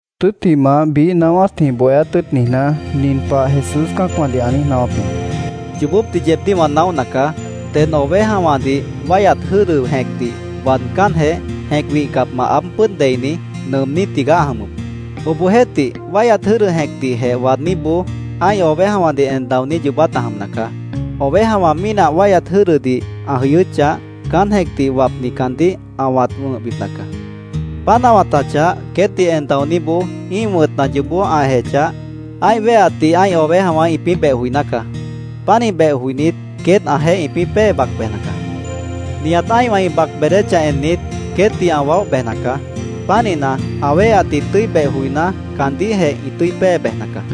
Tʉ́ttimah, biíh naáwátjĩh, bohéát tʉ́ʉt niijná, nin pah Jesús cã́acwãdih ã niíj naáwáp jĩ: “Yoobópdih yeebdíh wã naóhna caá. Ded ovejawãdih wáihyat jʉ́dʉ jẽcdih waadcánjeh, jẽc wihcapmant aáb pʉ́ʉd deini, nʉʉmní tigaá ã jʉmʉp. Obohjeéhtih, wáihyat jʉ́dʉ jẽcdihjeh waadníboó ã́ih ovejawãdih en daoní yoobát ã jʉmna caá. Ovejawã mínah wáihyat jʉ́dʉdih ã jʉyʉ́chah, caán jẽcdih wapni caandíh ã wãt wʉ̃hbipna caá. Páant ã wãtachah, queétdih en daoníboó ĩ́ih wʉ̃tna yoobó ã ejechah, ã́ih wéheatdih ã́ih ovejawã ĩpĩ́ beh joiná caá. Pánih beh joinít, queét ãjeéh ĩpĩ́ pée bac bejna caá. Nihat ã́ihwã ĩ bac beedéchah ennit, queétdih ã waóh bejna caá. Pánihna, ã wéheatdih tʉ́i beh joiná, caandíhjeh ĩ tʉ́i pée bejna caá.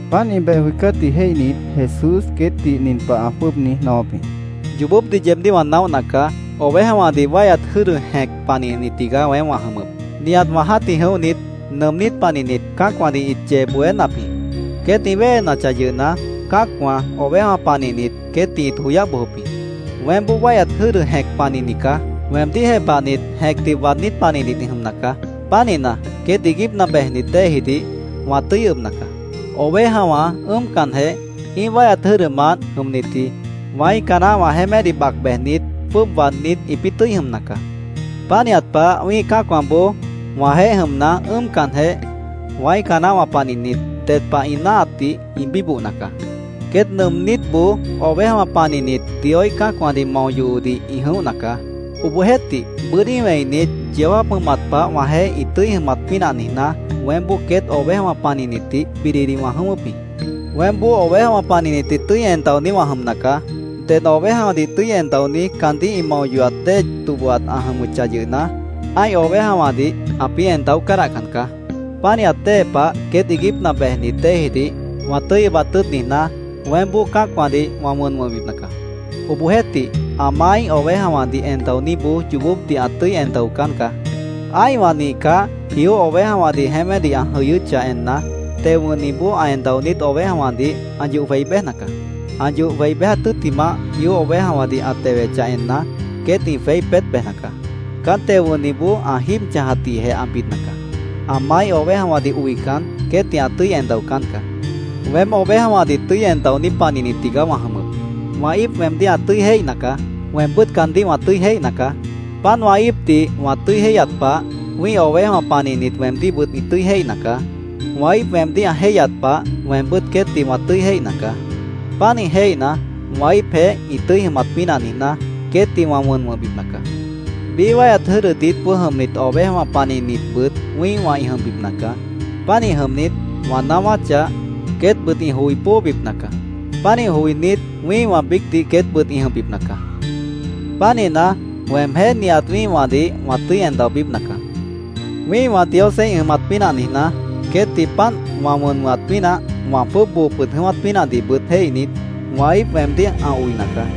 Páant ĩ beh joicátdih jéihnit, Jesús queétdih nin pah ã jwʉ́ʉb niíj naáwáp jĩ: “Yoobópdih yeebdíh wã naóhna caá. Ovejawãdih wáihyat jʉ́dʉ jẽc panihni tigaá weém wã jʉmʉp. Nihat wã jã́tih jʉ̃óhnit, nʉʉmnít panihnit, cã́acwãdih ĩt yee bohénap jĩ. Queét ĩ wéhenachah yʉhna, cã́acwã, ovejawã panihnit, queétdih ĩt joyáh bojop jĩ. Weémboó wáihyat jʉ́dʉ jẽc panihni caá. Weemdíh jepahnit jẽcdih waadnít panihnit ĩ jʉmna caá. Pánihna, queét iiguípna bejnit déejidih wã tʉ́i ʉbna caá. Ovejawã ʉ́ʉmcanjeh, ĩ́ih wáihyat jʉ́dʉmant jʉmnitji wãíca naáhwã jeémédih bac bejnit, jwʉ́ʉb waadnít, ĩpĩ́ tʉ́i jʉmna caá. Pánihat pah, wĩ́ih cã́acwãboó wãjeéh jʉmna, ĩpĩ́ ʉ́ʉmcanjeh, wãíca naáhwã panihnit, ded pah ĩ náahatdih ĩ bíbohna caá. “Queét nʉʉmnítboó ovejawã panihnit Dioíh cã́acwãdih mao yohodih ĩ jʉ̃óhna caá. Obohjeéhtih, bʉ́dí wẽinit, yeó jáap jʉmat pah wãjeéh ĩ tʉ́i jʉmat pínah niijná, weémboó queét ovejawã panihnitdih bididih wã jʉ̃ʉ́wʉ́p jĩ. Weémboó ovejawã panihnitdih tʉ́i en daoní wã jʉmna caá. Ded ovejawãdih tʉ́i en daoní caandíh ĩ mao yohat dée tobohat ã jʉmʉchah yʉhna, ã́ih ovejawãdih ãpĩ́ en daó cádahcan caá. Pánihat dée pah queét iiguípna bejnit déejidih wã tʉ́i ʉbat tʉ́ʉt niijná, weémboó cã́acwãdih wã wʉn wʉ̃hbipna caá. Obohjeéhtih, ã maáíh ovejawãdih en daoníboó yoobópdih ã tʉ́i en daocán caá. Ã́ihwã nihcah, jió ovejawãdih jeémédih ã jʉ̃ʉ́wʉ́chah enna, teo wʉ̃hniboó ã en daonít ovejawãdih ã yoh jwei béjna caá. Ã yoh jwei béjat tʉ́ttimah, jió ovejawãdih ã tewechah enna, queét ĩ jweí peét bejna caá. Caán teo wʉ̃hniboó ã jíib chãjatdihjeh ã bidna caá. Ã maáíh ovejawãdih oican, queétdih ã tʉ́i en daocán caá. “Weém ovejawãdih tʉ́i en daoní panihni tigaá wã jʉmʉp. Wã íip weemdíh ã tʉ́i jéihna caá. Weembʉ́t caandíh wã tʉ́i jéihna caá. Páant wã íipdih wã tʉ́i jéihyat pah, wĩ́ih ovejawã panihnit weemdíhbʉt ĩ tʉ́i jéihna caá. Wã íip weemdíh ã jéihyat pah, weembʉ́t queétdih wã tʉ́i jéihna caá. Pánih jéihna, wã íipjeéh ĩ tʉ́i jʉmat pínah niijná, queétdih wã wʉn wʉ̃hbipna caá. Biíh wáihyat jʉ́dʉ diítboó jʉmnit ovejawã panihnitbʉt wĩ́ihwã ĩ jʉmbipna caá. Pánih jʉmnit, wã naáwáchah, queétbʉt ĩ joi póobipna caá. Pánih joinít, wĩ́ihwã biícdih queétbʉt ĩ jʉmbipna caá.Pánihna, weemjéh nihat wĩ́ihwãdih wã tʉ́i en daobípna caá. “Wĩ́ihwã Diosjeéh ĩ jʉmat pínah niijná, queétdih páant wã wʉn wʉ̃hat pínah, wã jwʉ́ʉb boo pʉd jʉ̃ʉ́wát pínahdihbʉt jéihnit, wã íip weemdíh ã oina caá.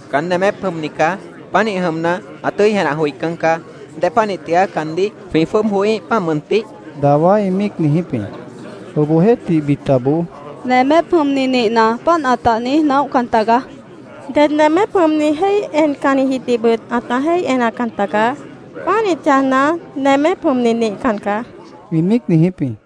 —Caán nemép jʉmni caá. Pánih jʉmna, ã tʉ́i jenah joicán caá. ¿Dépanih tigaá caandíh jwĩ jwʉ́ʉb joííh, páant mʉntih? dawá ĩ míic niijíp jĩ. Obohjeéhtih, bitaboó —Nemép jʉmni nihna, páant ãta niíj naóhcan tagaá. Ded nemép jʉmni jéih encannijidihbʉt ãta jéih enacan tagaá. Pánih chãjna, nemép jʉmni nihcan caá, ĩ míic niijíp jĩ.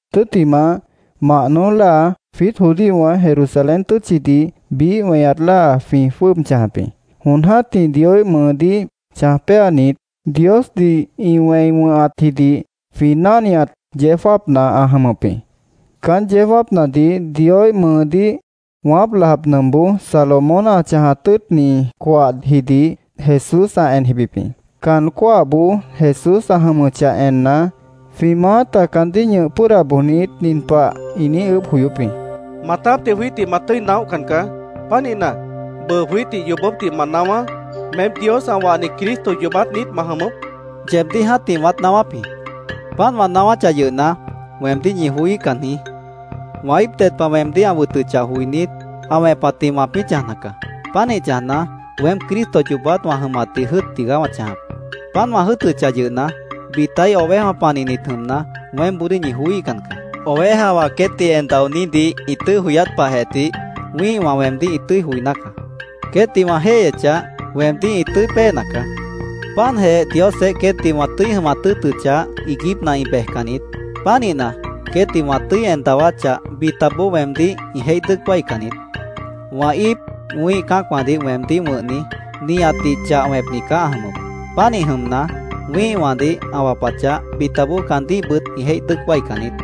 Tʉ́ttimah, mah noój láa, jwiít judíowã Jerusalén tʉ́tchidih biíh fiesta jwĩ jwʉ́ʉb chãjap jĩ. Jon jã́tih Dioíh mʉʉdíh chãj péanit, Diosdih ĩ wẽi wʉ̃hatjidih jwĩ náhniat yeó jáapna ã jʉmʉp jĩ. Caán yeó jáapnadih Dioíh mʉʉdíh wãáp lap nʉmpboó Salomón ã chãjat tʉ́ʉtni coahjidih Jesús ã en jibip jĩ. Caan cóahboó Jesús ã jʉmʉchah enna, jwĩ maáta caandíh ñʉh pʉ́ʉda bojnit, nin pah ĩ niíj ʉʉ́bh joyóp jĩ: —Maatápdih jwiítdih ma tʉ́i naóhcan caá. Pánihna, bʉʉ jwiítdih yoobópdih ma naáwá. ¿Meém Dios ã wahni Cristo yoobát niít ma jʉmʉp? Jesúsdih ĩ niijíp jĩ. —Yeebdíh jã́tih wãát naáwáp jĩ. Páant wã naáwáchah yʉhna, weemdíh ñi joííhcan jĩí. Wã íip ded pah weemdíh ã wʉtʉchah joinít, ã wẽpatjĩh wãpĩ́ chãjna caá. Pánih chãjna, weém Cristo yoobát wã jʉmatdih jʉ́ʉt tigaá wã chãjap. Páant wã jʉ́ʉtʉchah yʉhna, bitaíh ovejawã panihnit jʉmna, weémboodíh ñi joííhcan caá. Ovejawã queétdih en daonídih ĩ tʉ́i joyát pahjeh tih, wĩ́ihwã weemdíh ĩ tʉ́i joiná caá. Queétdih wã jéihyechah, weemdíh ĩ tʉ́i péena caá. Páantjeh Diosjeéh queétdih wã tʉ́i jʉmat tʉ́ʉtʉchah, iiguípna ĩ bejcan niít. Pánihna, queétdih wã tʉ́i en dawáchah, bitaboó weemdíh ĩ jéih dʉ́ʉc wáican niít. Wã íip, wĩ́ih cã́acwãdih weemdíh wʉ̃hni, nihatdih chah wẽpni caá ã jʉmʉp. Pánih jʉmna, wĩ́ihwãdih ã wapachah, bitaboó caandíhbʉt ĩ jéih dʉ́ʉc wáican niít.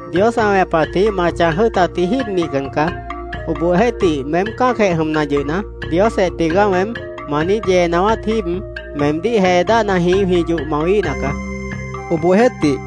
—Dios ã wẽpatjĩh ma chãj jʉ́ʉtatji jíib nihcan caá. Obohjeéhtih, meém cã́acjeh jʉmna yʉhna, ‘Diosjeh tigaá weém’, ma niíj yee naáwát jíib, meemdíh jee dáhnajĩh jwĩ yoh mawíhna caá, queét ĩ niíj jepahap jĩ.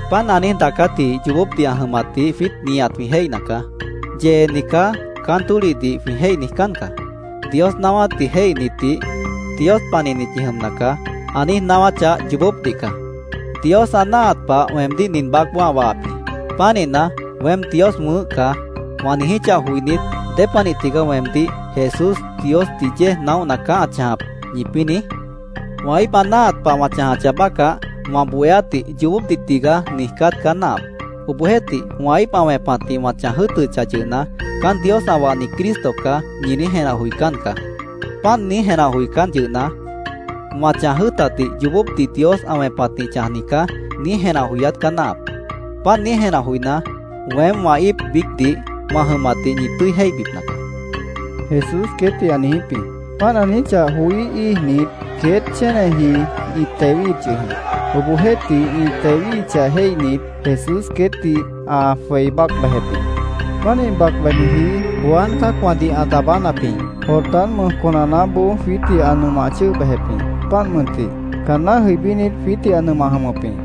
Páant ã niíj daacátji yoobópdih ã jʉmatdih jwiít nihat jwĩ jéihna caá. ‘Yeeni caá’, caán tólihdih jwĩ jéih niijcán caá. Dios naáwátdih jéihnitdih ‘Dios panihnit ñi jʉmna caá’, ã niíj naáwáchah, yoobópdih caá. Dios ã náahat pah weemdíh nin baácboó ã wahap jĩ. Pánihna, ‘Weém Dios wʉ̃ʉ́h caá’, wã niijíchah joinít, ¿dépanih tigaá weemdíh ‘Jesús Diosdih yéej naóhna caá ã chãjap’, ñipĩ́ niíj? Wã íip ã náahat pah wã chãjcah bácah, wã bohéátdih ‘Yoobópdih tigaá’, niijcát caá náahap. Obohjeéhtih, wã íip ã wẽpatjĩh wã chãj jʉ́ʉtʉchah yʉhna, ‘Caán Dios ã wahni Cristo caá’, ñi niíj jenah joicán caá. Páant niíj jenah joicán yʉhna, wã chãj jʉ́ʉtatdih ‘Yoobópdih Dios ã wẽpatjĩh chãjni caá’, niíj jenah joyát caá náahap. Páant niíj jenah joiná, weém wã íip biícdih wã jʉmatdih ñi tʉ́i jéihbipna caá, Jesús queétdih ã niijíp jĩ. Páant ã niijíchah joí íijnit, queét chéneji ĩ tewíhip yʉh jĩ. Obohjeéhtih, ĩ tewíhichah jéihnit, Jesús queétdih ã jwei bác bejep jĩ. Pánih bac bejniji Juan cã́acwãdih ã daabánapji, Jordán mʉj conanaáboó jwiítdih ã nʉmah chʉ́ʉh bejep jĩ, páant mʉntih. Caanná jʉibínit, jwiítdih ã nʉmah jʉmʉp jĩ.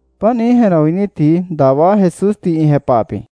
Páant niíj jenah joinítji dawá Jesúsdih ĩ jepahap jĩ.